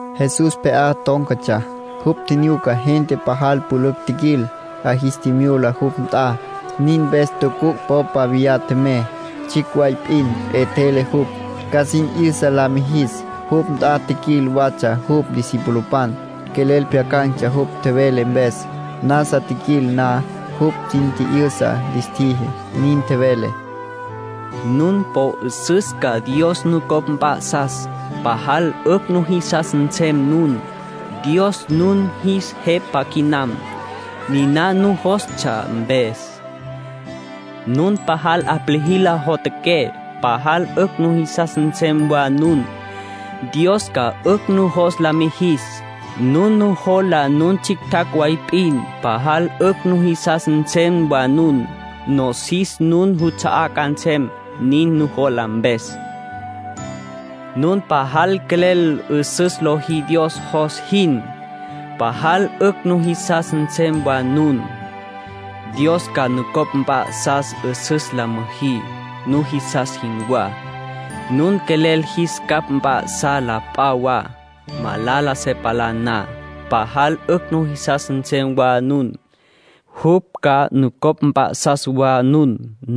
Jesús pje'á tón̈catsja. Jupj tjinyuca gente pajal pülücj tjiquil, 'a jis tjimyula jupj nt'a. Nin mpes tucuc' popa viyá tjemey, tsjicj way p'in. 'Etjele jupj, ca sin 'yüsa la mijis. Jupj nt'a tjiquil watsja jupj discipulopan. Quelel pjyacan̈tsja jupj tjevele mpes. Nasa tjiquil na, jupj sin tji'yüsa lis tjiji. Nin tjevele: “Nun po jisas ca Dios nucopj mp'a'sas, pajal 'ücj nujisas nsem nun. Dios nun jis Jepa quinam, niná nujostsja mpes. Nun pajal 'aplijila jotjaqué, pajal 'ücj nujisas nsem wa nun. Dios ca 'ücj nujos la mijis. Nun nujola nun tsjictjacj way p'in, pajal 'ücj nujisas nsem wa nun. Nosis nun nuts'a'á ca nsem, nin nujola mpes. Nun pajal quelel 'üsüs lojí Dios jos jin, pajal 'ücj nujisas nsem wa nun. Dios ca nucopj mp'a'sas ca 'üsüs la müjí, nujisas jinwá. Nun quelel jis capj mp'a'sá la p'a wa, malala se palá na, pajal 'ücj nujisas nsem wa nun. Jupj ca nucopj mp'a'sas wa nun.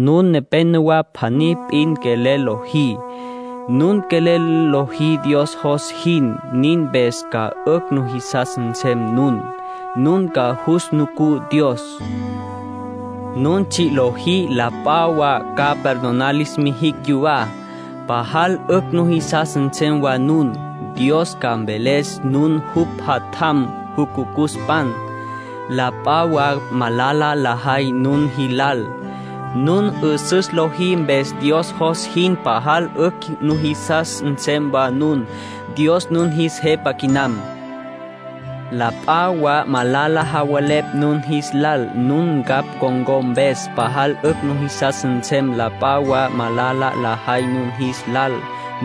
Nun nepénowa pjaní p'in quelel lojí. Nun quelel lojí Dios jos jin. Nin mpes ca 'ücj nujisas nsem nun. Nun ca jus nucú Dios. Nun tsji' lojí, la p'a wa ca perdonar lis mijicj yupj yuwá, pajal 'ücj nujisas nsem wa nun. Dios ca mveles nun jupj jatjampan, jucucuspan. La p'a wa malala lajay nun jilal, nun 'üsüs lojí mpes Dios jos jin, pajal 'ücj nujisas nsem wa nun. Dios nun jis Jepa quinam. ”La p'a wa malala javelepj nun jis lal nun ncapj con̈có mpes, pajal 'ücj nujisas nsem. La p'a wa malala lajay nun jis lal,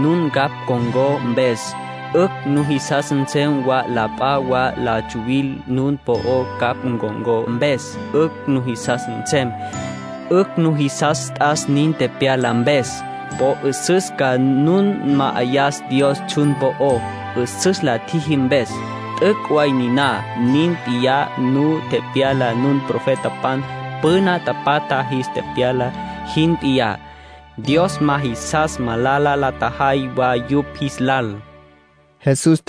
nun ncapj con̈có mpes, 'ücj nujisas nsem wa. La p'a wa la tsuwil nun po'ó ncapj con̈có mpes, 'ücj nujisas nsem. 'Ücj nujisas t'as nin tepyala mpes. Po 'üsüs ca nu ma'ayas Dios tsjun po'ó, 'üsüs la tjüjí mpes. T'üc' way niná. Nin p'iyá nu tepyala nun, profetapan püna tapatja jis tepyala jin p'iyá. Dios ma jisas malala la tjajay wa yupj jis lal”, nin tjevele Jesús.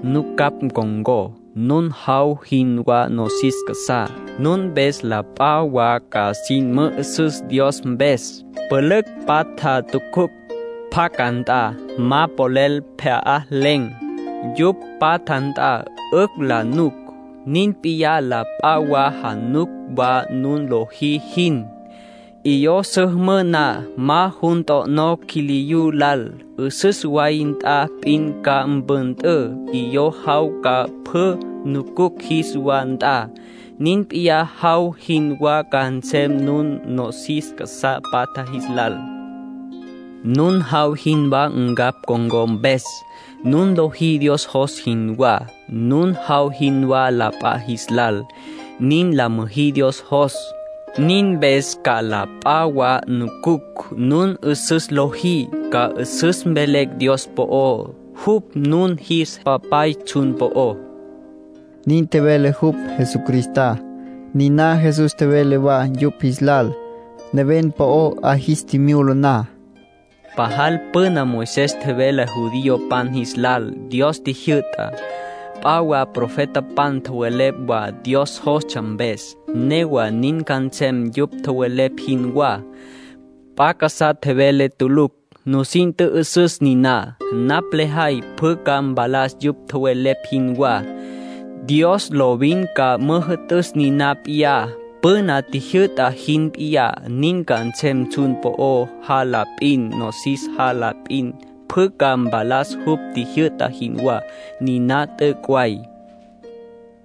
”Nun ncapj con̈có, nun jaw jinwá nosis casa'á. Nun mpes la p'a wa ca sin mü'üsüs Dios mpes. Pülücj patja tucuc' pacá nt'a, ma polel pjya'len̈. Yupj patja nt'a 'ücj la nuc. Nin p'iyá, la p'a wa januc wa nun lojí jin. 'Iyó su müjǘ na, ma jun t'o'nó quiliyú lal. 'Üsüs way nt'a p'in ca mpüntǘ, 'iyó jaw ca pjü nucucj jis wa nt'a. Nin p'iyá jaw jinwá ca nsem nun, nosis casá patja jis lal. Nun jaw jinwá ncapj con̈có mpes. Nun lojí Dios jos jinwá, nun jaw jinwá la p'a jis lal. Nin la müjí Dios jos. Nin mpes ca la p'a wa nucucj nun 'üsüs lojí. Ca 'üsüs mvelecj Dios po'ó. Jupj nun jis Papay tsjun po'ó”, nin tjevele jupj, Jesucristá. Niná Jesús tjevele wa yupj jis lal, neven po'o 'a jis tjimyula na: “Pajal püna Moisés tjevele judiopan jis lal Dios tjijyü'tá. P'a wa profetapan tjowelepj wa Dios jostsja mpes. Newa nin ca nsem yupj tjowelepj jinwá. P'a casá velé tulucj. Nusin tjü'üsüs niná. Napj lejay pjü ca mpalas yupj tjowelepj jinwá. Dios lovin ca müjü'tüs niná p'iyá, püna tjijyü'ta jin p'iyá. Nin ca nsem tsjun po'o jala p'in, nosis jala p'in. Pjü ca mpalas jupj tjijyü'ta jinwá. Niná t'üc' way.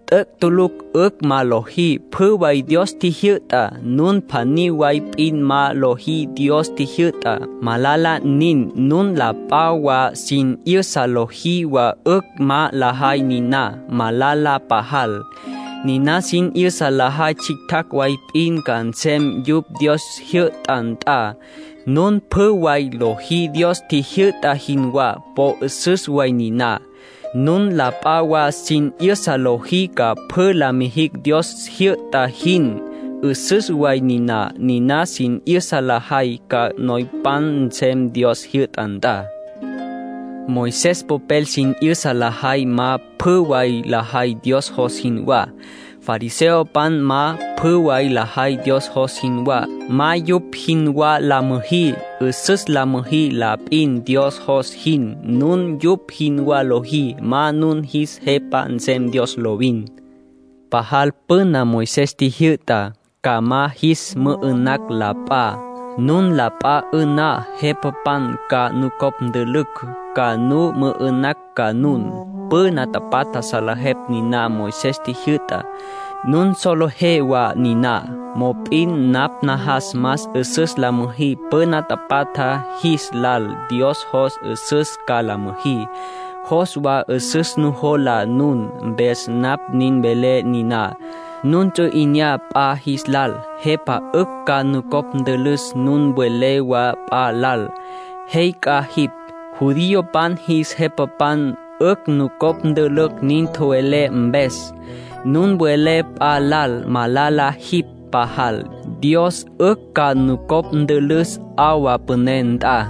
T'üc' tulucj 'ücj ma lojí pjü way Dios tjijyü'tá. Nun pjaní way p'in ma lojí Dios tjijyü'tá, malala nin. Nun la p'a wa sin 'yüsa lojí wa 'ücj ma lajay niná, malala pajal. Niná sin 'yüsa lajay tsjictjacj way p'in ca nsem yupj Dios jyü'ta nt'a. Nun pjü way lojí Dios tjijyü'ta jinwá, po 'üsüs way niná. Nun la p'a wa sin 'yüsa lojí ca pjü la mijicj Dios jyü'ta jin, 'üsüs way niná. Niná sin 'yüsa lajay, ca noypan nsem Dios jyü'ta nt'a. Moisés popel sin 'yüsa lajay ma pjü way lajay Dios jos jinwá. Fariseopan ma pjü way lajay Dios jos jinwá. Ma yupj jinwá la müjí. 'Üsüs la müjí la p'in Dios jos jin. Nun yupj jinwá lojí, ma nun jis Jepa nsem Dios lovin. ”Pajal püna Moisés tjijyü'ta: ‘Ca ma jis mü'ü'nacj la p'a’. Nun la p'a 'ü'ná, jepapan ca nucopj ntülücj, ca nu mü'ü'nacj ca nun. Püna tapatja salejeptsja niná Moisés tjijyü'tá. Nun solejé wa niná. Mop'in napj najas más 'üsüs la müjí püna tapatja jis lal. Dios jos 'üsüs ca la müjí. Jos wa 'üsüs nujola nun. Mpes napj nin velé niná: nun ts'u 'inyá p'a jis lal, jepa 'ücj ca nucopj ntülüs. Nun welé wa p'a lal: ‘Jey c'a jipj’, judiopan jis jepapan 'ücj nucopj ntülücj nin tjowelé mpes. Nun welé p'a lal: ‘Malala jipj pajal’, Dios 'ücj ca nucopj ntülüs 'awa püné nt'a.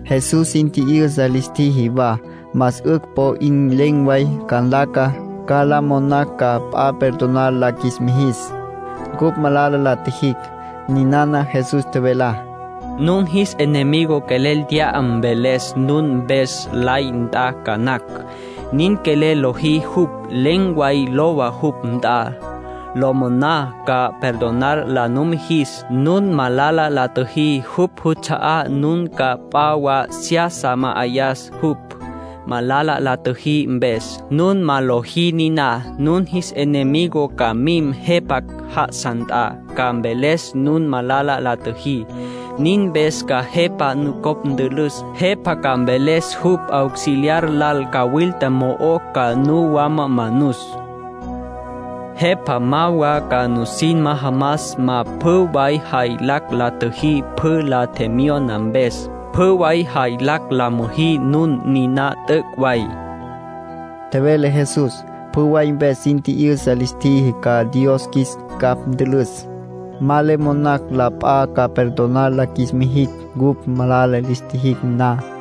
Jesús sin tji'yüsa lis tjiji wa más 'ücj po 'in len̈ way ca nlaca ca la monacj ca p'a perdonar la qjuis mijis, ncupj malala la tjijicj. Ninana Jesús tjevelá: “Nun jis enemigo quelel t'ya mveles nun mpes lay nt'a ca nacj. Nin quelel liji jupj, len̈ way lowa jupj nt'a. La moná ca perdonar la numijis. Nun malala la tjüjí jupj juts'a'á, nun ca p'a wa seyasa ma'ayá jupj, malala la tjüjí mpes. Nun ma lojí niná, nun jis enemigo ca mim jepa já'asa nt'a, ca mveles nun malala la tjüjí. Nin mpes ca jepa nucopj ntülüs. Jepa ca mveles jupj auxiliar lal cawilta mo'o ca nu wama manus. Jepa ma wa ca nusin majamas ma pjü way jaylacj la tjüjí jupj la tjemyona mpes. Pjü way jaylacj la müjí nun. Niná t'üc' way”, tjevele Jesús. Pjü way mpes sin tji'yüsa lis tjiji ca Dios qjuis capj ntülüs, ma le monacj la p'a ca perdonar la qjuis mijicj cupj malala lis tjijicj na.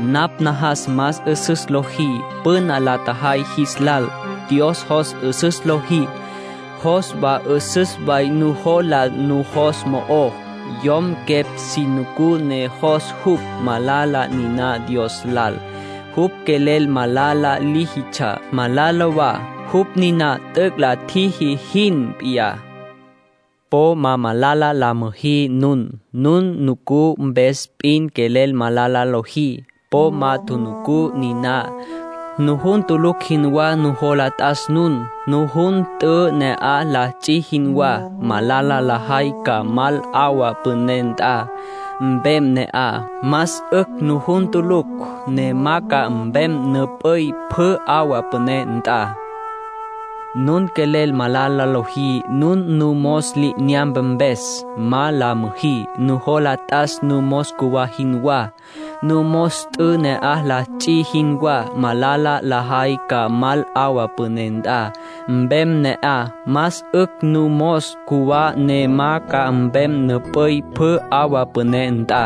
Napj najas más 'üsüs lojí püna la tjajay jis lal. Dios jos 'üsüs lojí. Jos wa 'üsüs way nujola nujos mo'ó. Yom quepj si nucú ne jos jupj, malala niná Dios lal. Jupj quelel malala líjitsja, malala wa, jupj niná t'üc' la tjiji jin p'iyá. ”Po ma malala la müjí nun. Nun nucú mpes p'in quelel malala lojí, po ma tjunucú niná. Nujun tulucj jinwá nujola t'as nun, nujun t'ü, na'aj la ts'i jinwá. Malala lajay ca mal 'awa püné nt'a, mpem ne'aj. Más 'ücj nujun tulucj, ne ma ca mpem nup'üy pjü 'awa püné nt'a. Nun quelel malala lojí nun numos li'inyampe mpes, ma la müjí. Nujola t'as numos cjuwá jinwá, numos t'ü, na'aj la ts'i jinwá. Malala lajay ca mal 'awa püné nt'a, mpem ne'aj. Más 'ücj numos cjuwá ne ma ca mpem nup'üy pjü 'awa püné nt'a.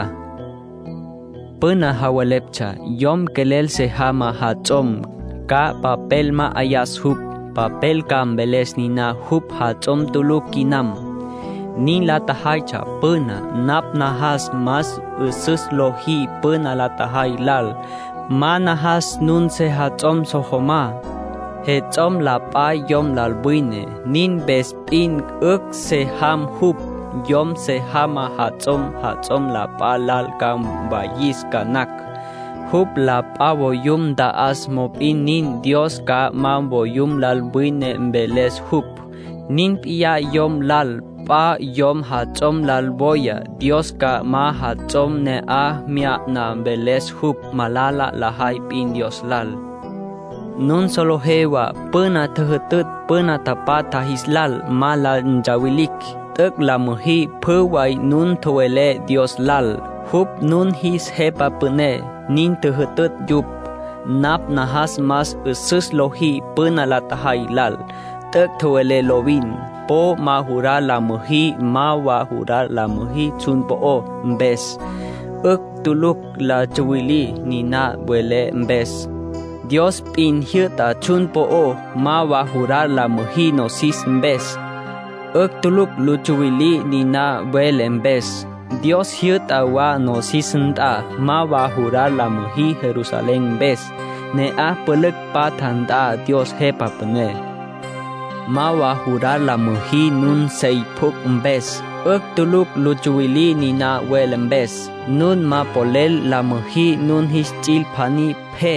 ”Püna javeleptsja: ‘Yom quelel se jamá jats'om, ca papel ma'ayas jupj. Papel ca mveles niná jupj jats'om tulucj quinam.’ Nin la tjajaytsja püná. Napj najas más 'üsüs lojí püna la tjajay lal. Ma najas nun sejats'om so jamá. Jets'om la p'a yom lal wine, nin mpes p'in 'ücj se jam jupj. Yom se jamá jats'om, jats'om la p'a lal ca mwayis ca nacj. Jupj la p'a voyum nta'as, mop'in nin, Dios ca ma voyum lal wine mveles jupj. Nin p'iyá yom lal. P'a yom jats'om lal woya, Dios ca ma jats'om ne'aj mya'na mveles jupj. Malala lajay p'in Dios lal. ”Nun solejé wa püna tjüjütütj püna tapatja jis lal ma la ntsawilicj. ‘T'üc' la müjí pjü way nun tjowelé Dios lal. Jupj nun jis Jepa Püné’, nin tjüjütütj yupj. Napj najas más 'üsüs lojí püna la tjajay lal. T'üc' tjowelé lovin. Po ma jurar la müjí. Ma wa jurar la müjí tsjun po'ó mpes. 'Ücj tulucj lu tsuwilí niná welé mpes. Dios p'in jyü'ta tsjun po'ó. Ma wa jurar la müjí nosis mpes. 'Ücj tulucj lu tsuwilí niná welé mpes. Dios jyü'ta wa nosis nt'a. Ma wa jurar la müjí Jerusalén mpes. Ne'aj pülücj patja nt'a Dios Jepa Püné. Ma wa jurar la müjí nun sey pjucj mpes. 'Ücj tulucj lu tsuwilí niná welé mpes. Nun ma ca polel la müjí nun jis ts'il pjaní pje,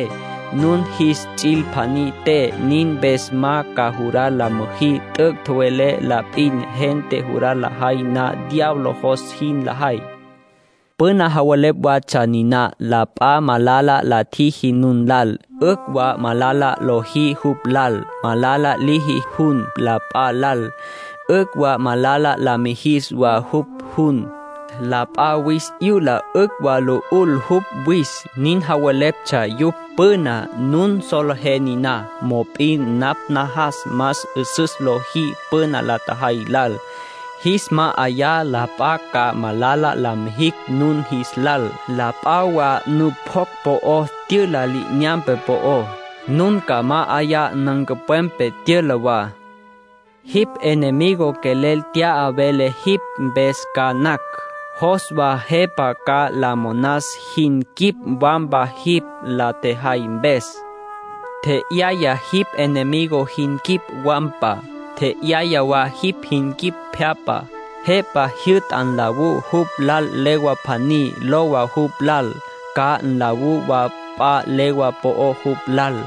nun jis ts'il pjaní te. Nin mpes ma ca jurar la müjí. T'üc' tjowelé la p'in. Gente jurar lajay na, diablo jos jin lajay. ”Püna javelepj watsja niná: la p'a malala la tjiji nun lal, 'ücj wa malala lojí jupj lal. ‘Malala liji jun la p'a lal, 'ücj wa malala la mijis wa jupj jun. La p'a wis 'yula, 'ücj wa lu 'ul jupj wis’, nin javeleptsja yupj püná. Nun solejé niná. Mop'in napj najas más 'üsüs lojí püna la tjajay lal. Jis ma'ayá la p'a ca malala la mijicj nun jis lal. La p'a wa nupjocj po'o tyüla li'inyampe po'ó, nun ca ma'ayá nancupwepe tyüla wa. Jipj enemigo quelel t'ya vele jipj mpes ca nacj. Jos wa jepa ca la monas jin quip wampa, jipj la tjejay mpes. Tje'yaya jipj enemigo jin quip wampa. Tje'yaya wa jin quip pje'apa. Jepa jyü'ta nlawú jupj lal legua pjaní, lowa jupj lal. Ca nlawú wa p'a legua po'ó jupj lal.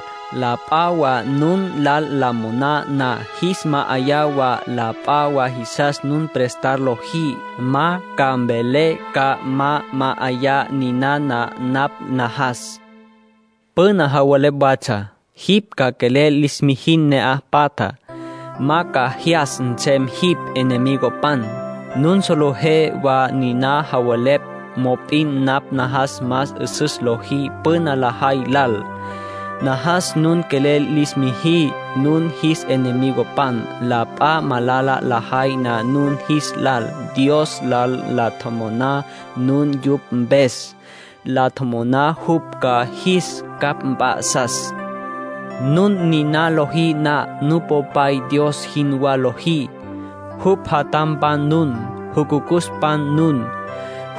La p'a wa nun lal la mon na, jis ma'ayá wa. La p'a wa jisas nun prestar lojí, ma ca mvelé ca ma ma'ayá. Ninana napj najas. ”Püna javelepj watsja: ‘Jipj ca quelel lis mijin ne'aj patjá. Ma ca jyas nsem jipj enemigopan.’ Nun solejé wa niná tjowelepj. Mop'in napj najas más 'üsüs lojí püna la tjajay lal. Najas nun quelel lis müjí nun jis enemigopan. La p'a malala lajay na nun jis lal, Dios lal la tjomoná nun yupj mpes. La tjomoná jupj ca jis capj mp'a'sas. Nun niná lojí na, Nupopay Dios jinwá lojí. Jupj jatjampan nun, jucucuspan nun.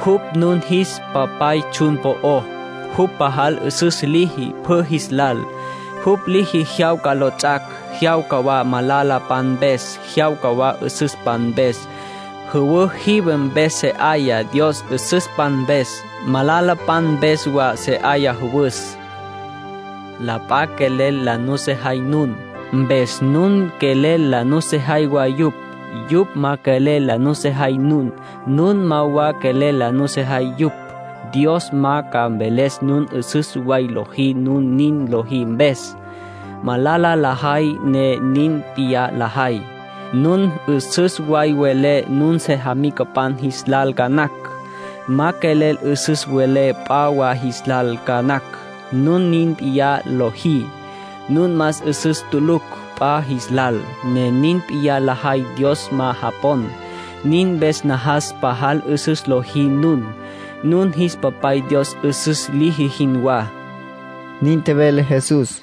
Jupj nun jis Papay tsjun po'ó. Jupj pajal 'üsüs liji pjü jis lal. Jupj liji jyawca lots'ac'. Jyawca wa malalapan mpes. Jyawca wa 'üsüspan mpes. Jüwǘ jive mpes se 'aya Dios 'üsüspan mpes, malalapan mpes wa se 'aya jüwüs. La p'a quelel la nusejay nun, mpes nun quelel la sojí wa yupj. Yupj ma quelel la nusejay nun, nun ma wa quelel la sojí yupj. Dios ma ca mveles nun 'üsüs way lojí nun nin lojí mpes. Malala lajay ne nin p'iyá lajay. Nun 'üsüs way welé nun sejamicapan jis lal ca nacj. Ma quelel 'üsüs welé p'a wa jis lal ca nacj. Nun nin p'iyá lojí, nun más 'üsüs tulucj p'a jis lal. Ne nin p'iyá lajay Dios ma japon. Nin mpes najas pajal 'üsüs lojí nun, nun jis Papay Dios 'üsüs liji jinwá”, nin tjevele Jesús.